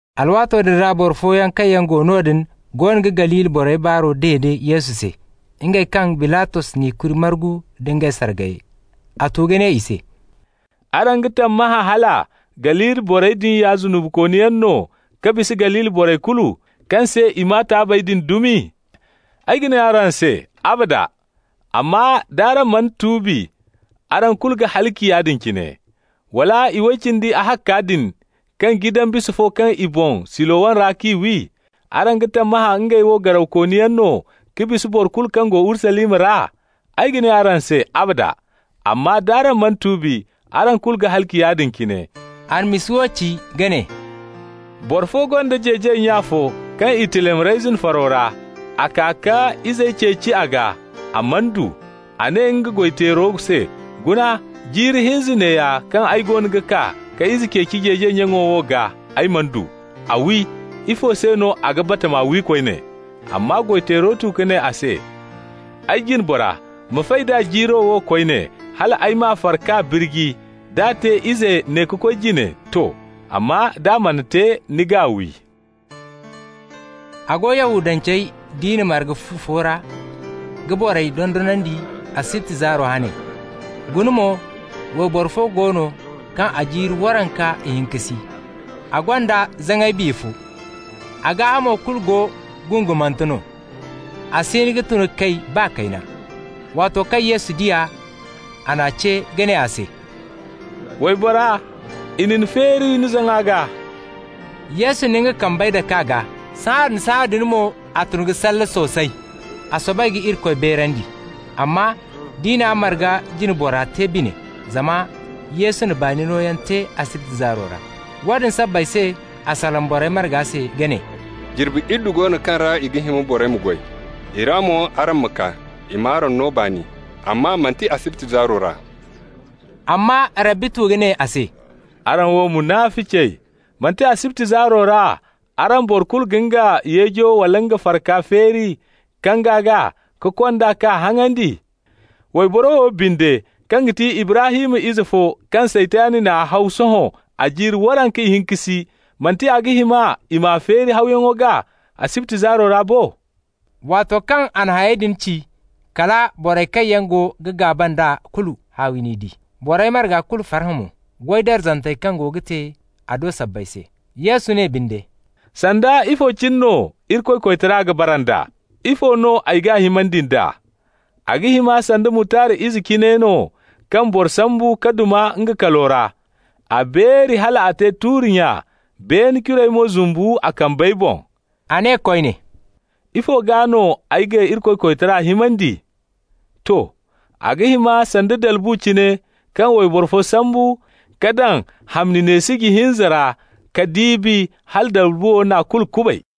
Alwaato din ra boro fooyaŋ kaŋ go noodin goono ga Galili borey baaro dede Yesu se, ngey kaŋ Bilatos n'i kuri margu nda ngey sargayey. A tu ka ne i se: «Araŋ ga tammahã hala Galili borey din ya zunubikooniyaŋ no ka bisa Galili borey kulu, kaŋ se i maa taabey din dumi? Ay ga ne araŋ se: abada! Amma d'araŋ mana tuubi, araŋ kulu ga halaci yaadin cine. Wala iway cindi ahakka din, kaŋ jidan bisa fo kaŋ i boŋ Silowam ra k'i wi -- araŋ ga tammahã ngey wo garawkooniyaŋ no ka bisa boro kulu kaŋ go Urusalima ra? Ay ga ne araŋ se: abada! Amma d'araŋ mana tuubi, araŋ kulu ga halaci yaadin cine.» A na misa wo ci, ka ne: «Boro fo gonda jeejay nya fo kaŋ i tilam reyzin faro ra. A kaa ka izey ceeci a gaa, a mana du. A ne nga goy-teero se: ‹Guna. Jiiri hinza neeya kaŋ ay goono ga kaa ka ize ceeci jeejay nyaŋo wo gaa, ay mana du. A wi. Ifo se no a ga batama wi koyne?› Amma goy-teero tu ka ne a se: ‹Ay jine bora, ma fay d'a jiiro wo koyne, hal ay m'a far k'a birji. D'a te izey ne ka koy jine, to! Amma d'a mana te, ni g'a wi.›» A go Yahudance diina marga fu fo ra, ka borey dondonandi asibti zaaro hane. Guna mo, wayboro fo go no kaŋ a jiiri waranka ihinka si, a gonda zaŋay biya fo. A gaahamo kulu go gungumante no, a si hin ka tun ka kay, baa kayna. Waato kaŋ Yesu di a, a n'a ce ka ne a se: «Waybora, i na ni feeri ni zaŋa gaa.» Yesu na nga kambey dak'a gaa, sahãadin-sahãadin mo a tun ka salle soosay. A soobay ka Irikoy beerandi. Amma diina marga jine bora te bine zama Yesu na baani nooyaŋ te asibti zaaro ra. Woodin sabbay se a salaŋ borey marga se ka ne: «Jirbi iddu go no kaŋ ra a ga hima borey ma goy. I ra mo araŋ ma kaa, i m'araŋ no baani, amma manti asibti zaaro ra.» Amma Rabbi tu ka ne a se: «Araŋ wo munaficey! Manti asibti zaaro ra araŋ boro kulu ga nga yeejo wala nga farka feeri kanga gaa, ka kond'a k'a haŋandi? Wayboro wo binde, kaŋ ga ti Ibrahim ize fo kaŋ Saytan n'a haw sohõ a jiiri waranka ihinka si, manti a ga hima i m'a feeri hawyaŋo gaa asibti zaaro ra bo?» Waato kaŋ a na hayey din ci, kala borey kaŋ yaŋ go ga gaaba nd'a kulu, haawi n'i di. Borey marga kulu farhã mo, goy darzantey kaŋ go ga te a do sabbay se. Yesu ne binde: «Sanda ifo cine no Irikoy koytara ga bara nd'a? Ifo no ay g'a himandi nd'a? A ga hima sanda mutard ize cine no kaŋ boro sambu ka duma nga kalo ra. A beeri hal a te tuuri-nya, beene curey mo zumbu a kambey boŋ.» A ne koyne: «Ifo gaa no ay ga Irikoy koytara himandi? To. A ga hima sanda dalbu cine kaŋ wayboro fo sambu ka daŋ hamni neesiji hinza ra ka diibi, hala dalbuwo n'a kulu kubay.»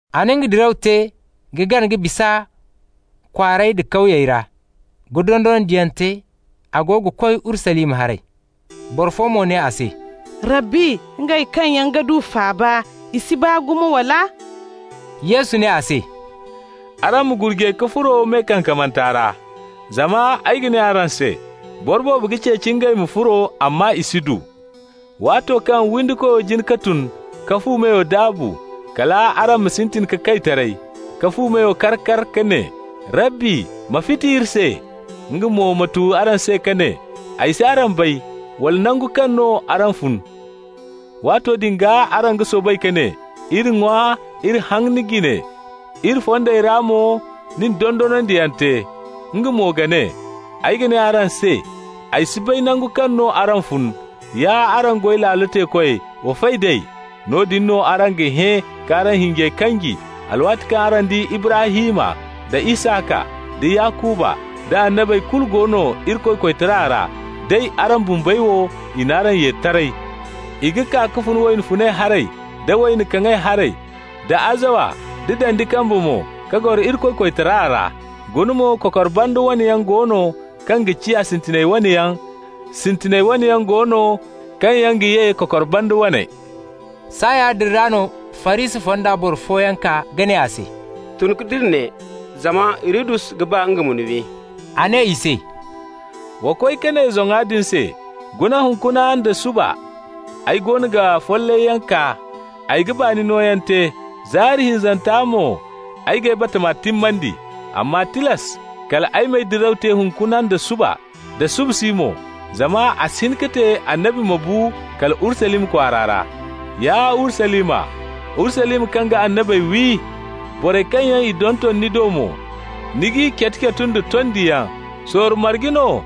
A na nga diraw te ka gana ka bisa kwaarey da kawyey ra, ka dondonandiyaŋ te, a go ga koy Urusalima haray. Boro fo mo ne a se: «Rabbi, ngey kaŋ yaŋ ga du faaba, i si baa gumo, wala?» Yesu ne a se: «Araŋ ma gurjay ka furo me kankamanta ra. Zama ay ga ne araŋ se: boro boobo ga ceeci ngey ma furo, amma i si du. Waato kaŋ windikoyo jin ka tun ka fu meyo daabu, kal araŋ ma sintin ka kay taray, ka fu meyo kar ka ne: ‹Rabbi, ma fiti iri se!› Nga mo ma tu araŋ se ka ne: ‹Ay si araŋ bay, wala nangu kaŋ no araŋ fun.› Waato din gaa araŋ ga soobay ka ne: ‹Iri ŋwa, iri haŋ ni jine, iri fondey ra mo ni na dondonandiyaŋ te.› Nga mo ga ne: ‹Ay ga ne araŋ se: ay si bay nangu kaŋ no araŋ fun. Ya araŋ goy laalo teekoy, wa fay d'ay.› Noodin no araŋ ga hẽ ka araŋ hinjey kanji, alwaati kaŋ araŋ di Ibrahim, da Isaka, da Yakuba, da annabey kulu go no Irikoy koytara ra, day araŋ bumbey wo, i n'araŋ ye taray. I ga kaa ka fun wayna funay haray da wayna kaŋay haray, da azawa nda dandi kambe mo, ka goro Irikoy koytara ra. Guna mo, kokor banda wane yaŋ go no kaŋ ga ciya sintiney waney yaŋ. Sintina wane yaŋ go no kaŋ yaŋ ga ye kokor banda waney.» Saaya woodin ra no Farisi fonda boro fooyaŋ kaa ka ne a se: «Tun ka dira ne, zama Hirodus ga ba nga ma ni wi.» A ne i se: «Wa koy ka ne zoŋa din se: ‹Guna, hunkuna nda suba ay goono ga follayyaŋ kaa, ay ga baani nooyaŋ te, zaari hinzanta mo ay g'ay bata timmandi.› Amma tilas kal ay m'ay diraw te hunkuna nda suba nda subasi mo, zama a si hin ka te annabi ma bu kala Urusalima kwaara ra. Ya Urusalima, Urusalima kaŋ ga annabey wi. Borey kaŋ yaŋ i donton ni do mo, ni g'i catu-catu nda tondiyaŋ. Sorro marge no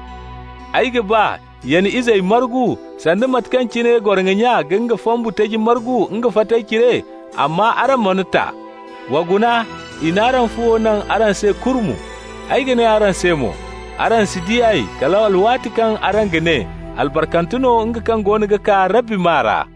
ay ga ba ya ni izey margu, sanda mate kaŋ cine goroŋo nya ga nga fambu taji margu nga fatey cire, amma araŋ mana ta. Wa guna, i n'araŋ fuwo naŋ araŋ se kurmu! Ay ga ne araŋ se mo: araŋ si di ay, kal alwaati kaŋ araŋ ga ne: ‹Albarkante no nga kaŋ goono ga kaa Rabbi maa ra.›»